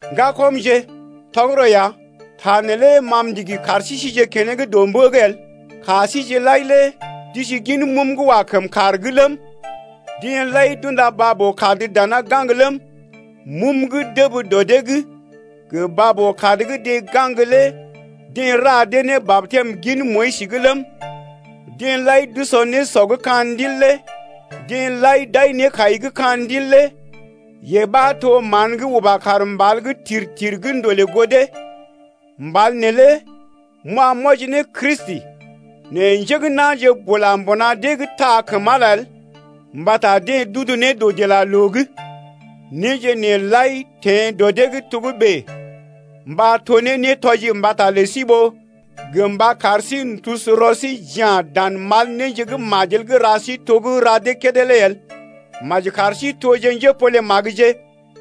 Ŋgakɔmje, tɔgərɔ ya, ta neelé ma m’ndigi kar sí síje keneŋ dɔ mbə’g el: ka síje lai lé d’isi gin mum gə́ wa kəm kàr’g ləm, deḛ lai d’unda baa-boo-kad dana gaŋg ləm, mum gə́ dəb dɔ dee’g gə baa-boo-kad gə́ deḛ gaŋg lé deḛ ra dee ne batɛm gin Moyis’g ləm, deḛ lai d’usɔ nésɔ gə́ ka̰ Ndil lé. Deḛ lai d’ai nékai gə́ ka̰ Ndil lé yee ɓa to mán gə́ uba kaar mbal’g tir-tir gə́ ndolè goo dee. Mbal neelé m’wa m’wɔji ne Kristi. Nɛ njé gə́ na̰je bula mbuna dee’g taa kəm Ala el mbata deḛ d’udu ne dɔdilaloo’g. Néje nee lai teḛ dɔ dee’g togə́bè mba to ne nétɔji mbata lə sí ɓó gə mba kar sí n’tusu rɔ sí j’ya̰ dan mal néje gə́ majel gə́ ra sí to gə́ ra dee kédé lé el. Maji kar sí toje njépole-magəje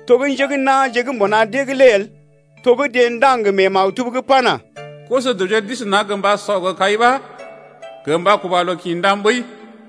to gə́ njé gə́ na̰je gə́ mbuna dee’g lé el. To gə́ deḛ ndaŋg mee maktub’g pana: Koso-dəwje d’isi naŋg gə mba sɔ gə kai ɓa gə mba kuba loo kḭ ndam ɓəi.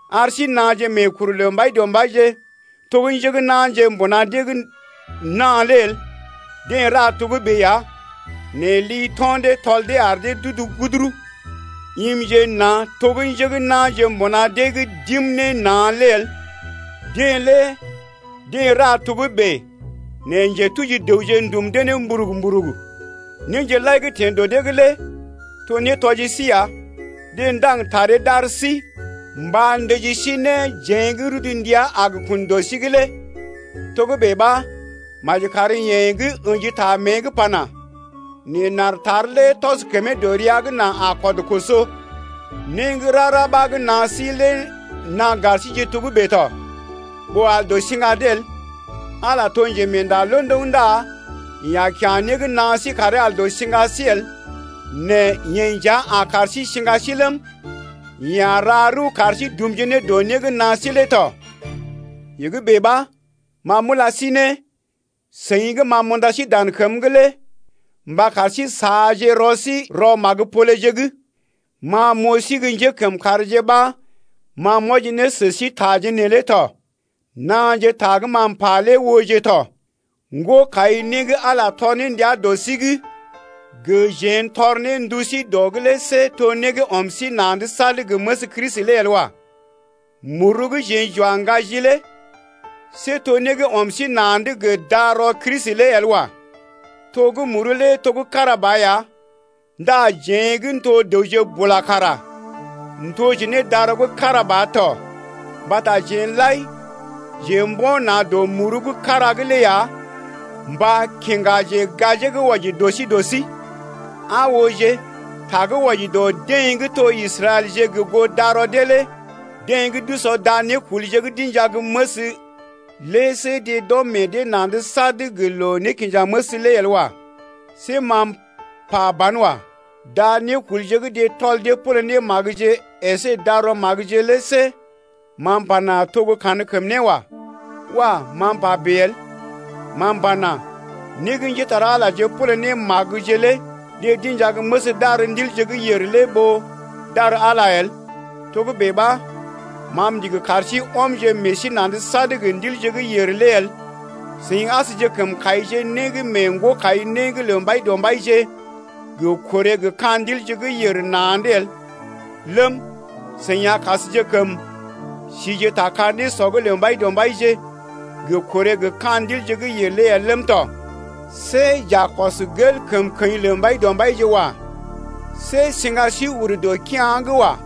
Ar sí naaje meekuru lə Mbaidɔmbaije to gə́ njé gə́ na̰je mbuna dee’g na̰ lé el, deḛ ra togə́bè ya nɛ li to̰ dee tɔl dee ar dee d’udu guduru. Imje na̰ to gə́ njé gə́ na̰je mbuna dee’g d’im ne na̰ lé el, deḛ lé deḛ ra togə́bè nɛ njetuji dəwje ndum dee ne mburug-mburug. Néje lai gə́ teḛ dɔ dee’g lé to nétɔji sí ya. Deḛ ndaŋg taree d’ar sí mba ndəji sí ne, jeḛ gə́ rudu ndəa a gə kun dɔ sí’g lé. Togə́bè ɓa maji kar yeḛ gə́ ə̰ji ta mée’g pana: Neḛ n’aar tar lé tɔs kəmee dɔ rəa’g, nà a kɔd koso. Né gə́ rara ɓa gə́ naa sí lé naa gar síje togə́bè tɔ, ɓó al dɔ siŋga dee el. Ala lé to njemeenda londoŋ ndá yeḛ a kya̰ né gə́ naa sí karee al dɔ siŋga sí el nɛ yeḛ nja a kar sí siŋga sí ləm, yeḛ a ra rəw kar sí dumje ne dɔ né gə́ naa sí lé tɔ. Yee gə́ bèe ɓa, ma m’ula sí ne, seḭ gə́ ma m’unda sí dan kəm’g lé mba kar sí saaje rɔ sí rɔ magə-poleje’g. Ma m’oo sí gə́ njékəmkàrje ɓa ma m’wɔji ne sə sí taje neelé tɔ. Naaje ta gə́ ma m’pa lé ooje tɔ. Ŋgo-kai-né gə́ Ala tɔr ne ndia dɔ sí’g gə jeḛ n’tɔr ne ndu sí dɔ’g lé see to né gə́ ɔm meḛ sí na̰’d sad gə məs Kristi lé el wa. Muru gə́ jeḛ j’wa n’gaji lé see to né gə́ ɔm sí na̰’d gə darɔ Kristi lé el wa. To gə́ muru lé to gə́ kára ba ya ndá jeḛ gə́ n’to dəwje bula kara n’toje ne darɔ gə́ kára ba to: mbata jeḛ lai jeḛ mbo̰ na̰ dɔ muru gə́ kára’g lé ya mba kiŋgaje gajee gə́ wɔji dɔ sí dɔ sí. Aa ooje, ta gə́ wɔji dɔ deḛ gə́ to Israɛlje gə goo darɔ dee lé: deḛ gə́ d’usɔ da nékulje gə́ d’inja gə́ məs lé see deḛ d’ɔm meḛ dee na̰’d sad gə loo-nékinjaməs lé el wa. See ma m’pa banwa. Da nékulje gə́ deḛ tɔl dee pole ne magəje əsé darɔ magəje lé see ma m’pana: To gə́ kankəmné wa. Wah! ma m’pa bèe el. Ma m’pana: Né gə́ njépole-magəje pole ne magəje lé deḛ d’inja gə́ məs d’ar ndilje gə́ yèr lé ɓó d’ar Ala el. Togə́bè ɓa, ma m’ndigi kar sí ɔmje meḛ sí na̰’d sad gə ndilje gə́ yèr lé el. Seḭ asjekəm kaije né gə́ mee ŋgo-kai-né’g lə Mbaidɔmbaije gə korè gə ka̰ ndilje gə́ yèr na̰’d el ləm, seḭ asjekəm sije ta ka nésɔ’g lə Mbaidɔmbaije gə korè gə ka̰ ndilje gə́ yèr lé el ləm tɔ. See j’a kɔs gel kəmkəḭ lə Mbaidɔmbaije wa. See siŋga sí ur dɔ kea̰’g wa.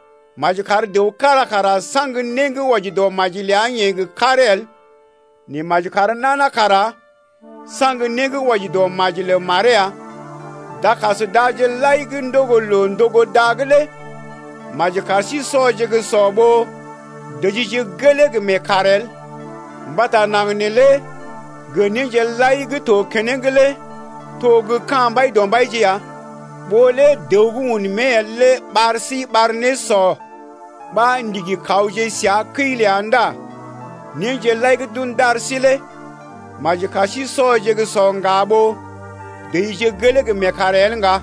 Maji kar dəw kára kara saŋg né gə́ wɔji dɔ maji ləa-yeḛ gə karee el nɛ maji kar nana kara saŋg né gə́ wɔji dɔ maji lə maree ya. Dakas daje lai gə́ ndogo loo-ndogo-da’g lé maji kar sí sɔje gə́ sɔ ɓó dəjije gelee gə meekaar el. Mbata naŋg neelé gə néje lai gə́ to keneŋ lé to gə́ ka̰ Mbaidɔmbaije ya. Ɓó lé dəw gə́ un mée el lé ɓar sí ɓar nésɔ ɓa ndigi kawje səa kəi ləa ndá néje lai gə́ d’un d’ar sí lé maji kar sí sɔje gə́ sɔ ŋga ɓó dəjije gelee gə meekaar el ŋga.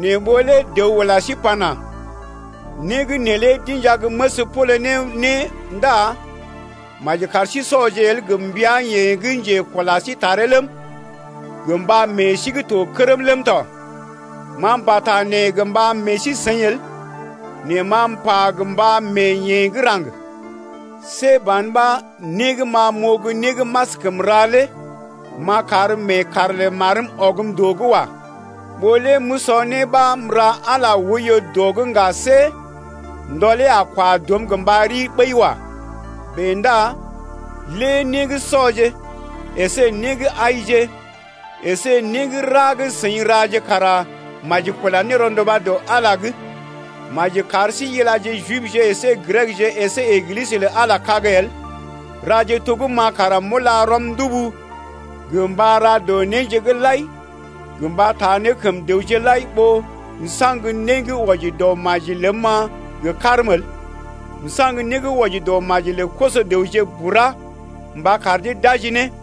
Nɛ ɓó lé dəw ula sí pana: Né gə́ neelé d’inja gə́ məs pole ne né ndá maji kar sí sɔje el gə mbəa-yeḛ gə́ njekula sí taree ləm, gə mba meḛ sí gə́ to kərm ləm tɔ. Ma m’pata nee gə mba meḛ sí-seḭ el nɛ ma m’pa gə mba mee yeḛ gə́ raŋg. See ban ɓa né gə́ ma m’oo gə́ né gə́ m’askəm ra lé m’a kar meekaar lə marm ɔgm dɔ’g wa. Ɓó lé m’usɔ né ɓa m’ra Ala oiyo dɔ’g ŋga see ndɔlee a kwa dɔm gə mba ri ɓəi wa. Bèe ndá lé né gə́ sɔje əsé né gə́ aije əsé né gə́ rara gə́ seḭ raje kara maji kula ne rɔnduba dɔ Ala’g lé. Maji kar sí ilaje Jibje əsé Grekje əsé Eglisə lə Ala kag el, raje to gə́ ma kara m’ula rɔm ndubu gə mba ra dɔ néje’g lai gə mba taa ne kəm dəwje lai ɓó m’saŋg né gə́ wɔji dɔ maji ləm-ma gə karm el. M’saŋg né gə́ wɔji dɔ maji lə koso-dəwje bura mba kar dee d’aji ne.